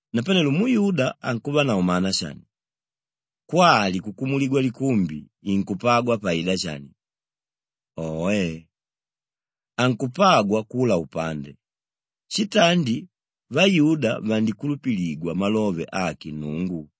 Napanelo muyuda ankuvanavo mana shani? Kwali kukumuligwa likumbi inkupagwa paida shani? Oe! Ankupagwa kula upande! Shitandi vayuda vandikulupiligwa malove ake Nnungu.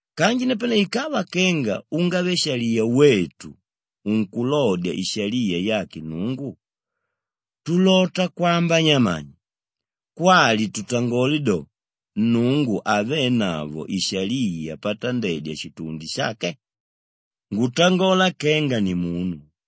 Kanji napane ikava kenga ungave-shaliya wetu unkulodya ishaliya yake Nnungu, tulota kwamba nyamani? Kwali tutangole do, Nnungu havenavo ishaliya patandedya shitundi shake? Ngutangola kenga nimunu.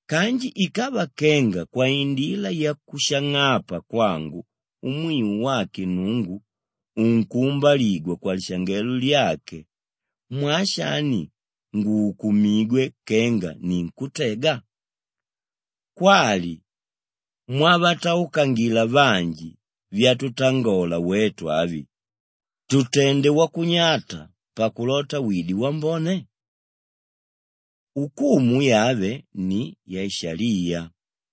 Kanji ikava kenga kwaindila yakushang'apa kwangu umwiu wake Nnungu unkuumbaligwa kwalishangelo lyake mwaa shani nguukumigwe kenga ninkútega? Kwali mwavataukangila vanji vyatutangola wetu avi, “Tutende wakunyata pakulota wide wambone.” Ukumu yave ni yashaliya.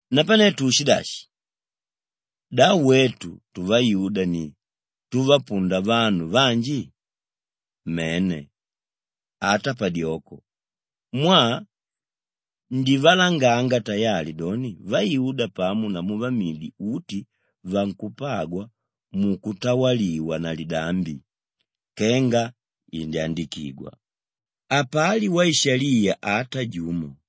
Napane tuushidashi? Da wetu tuvayuda ni túvapunda vanu vanji? Mene, ata padyoko! Mwaa ndivalanganga tayali doni vayuda pamo namu vamidi uti vankupagwa mukutawaligwa na lidambi kenga indyandikigwa, “Hapali waishaliya ata jumo,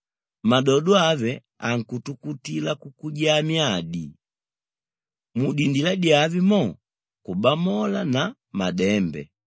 Madodo ave ankutukutila kukujaa myadi, mudindila dyave mo, kubamola na madembe,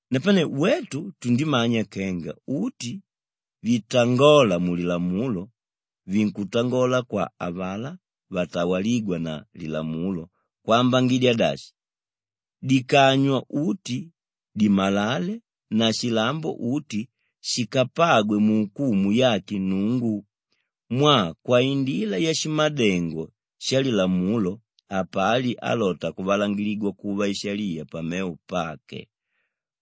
Napane wetu tundimanya kenga uti vitangóla mulilamulo vinkutangola kwa avalá vatawalígwa na lilamulo kwambangidya dashi, dikanywa uti dimalale na shilambo uti shikapagwe muukumu yake Nnungu mwaa kwaindila yashimadengo shalilamulo hapali álota kuvalangiligwa kuva ishaliya pamevo pake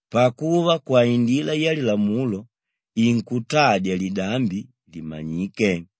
pakuva kwaindila yalilamulo inkutadya lidambi limanyike.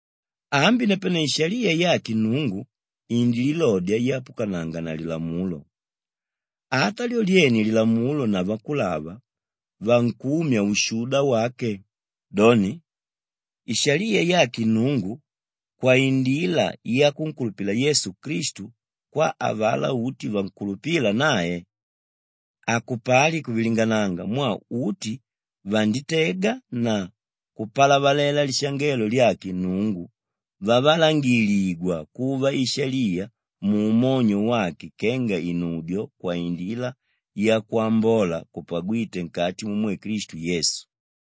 Ambi napane ishaliya yake Nnungu indililodya yapukananga na lilamulo; ata lyo lyene lilamulo na vakulava vankumya ushuda wake, doni, ishaliya yake Nnungu kwaindila yakunkulupila Yesu Klistu kwa avalá uti vankulupíla nae. Hakupali kuvilingananga mwaa uti vanditega na kupalavalela lishangelo lyake Nnungu vavalangiligwa kuva ishaliya muumonyo wake kenga inudyo kwaindila yakwambola kupagwíte nkati mumwe Klistu Yesu.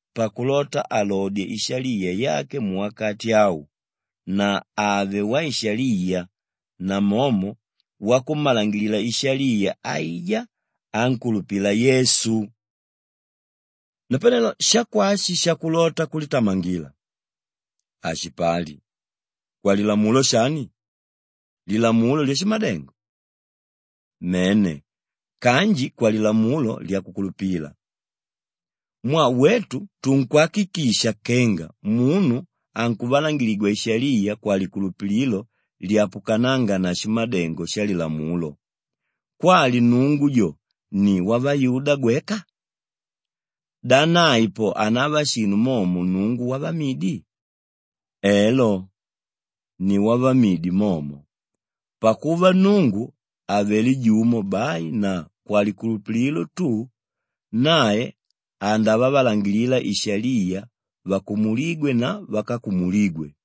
pakulota alodye ishaliya yake muwakati au na ave waishaliya namomo wakummalangilila ishaliya aijá ánkulupila Yesu. Napane shakwashi shakulota kulitamangila? Hashipali! Kwalilamulo shani? Lilamulo lyashimadengo? Mene kanji kwalilamulo lyakukulupila. Mwaa wetu tunkwakikisha kenga munu ankuvalangiligwa ishaliya kwalikulupililo lyapukanánga na shimadengo shalilamulo. Kwali Nnungu jo ni wavayuda gweka? Da nae po hanava shinu momo Nnungu wavamidi? Elo, ni wavamidi momo pakuva Nnungu avelé jumo bai na kwalikulupililo tu, nae andavavalangilila ishaliya vakumulígwe na vákakumuligwe.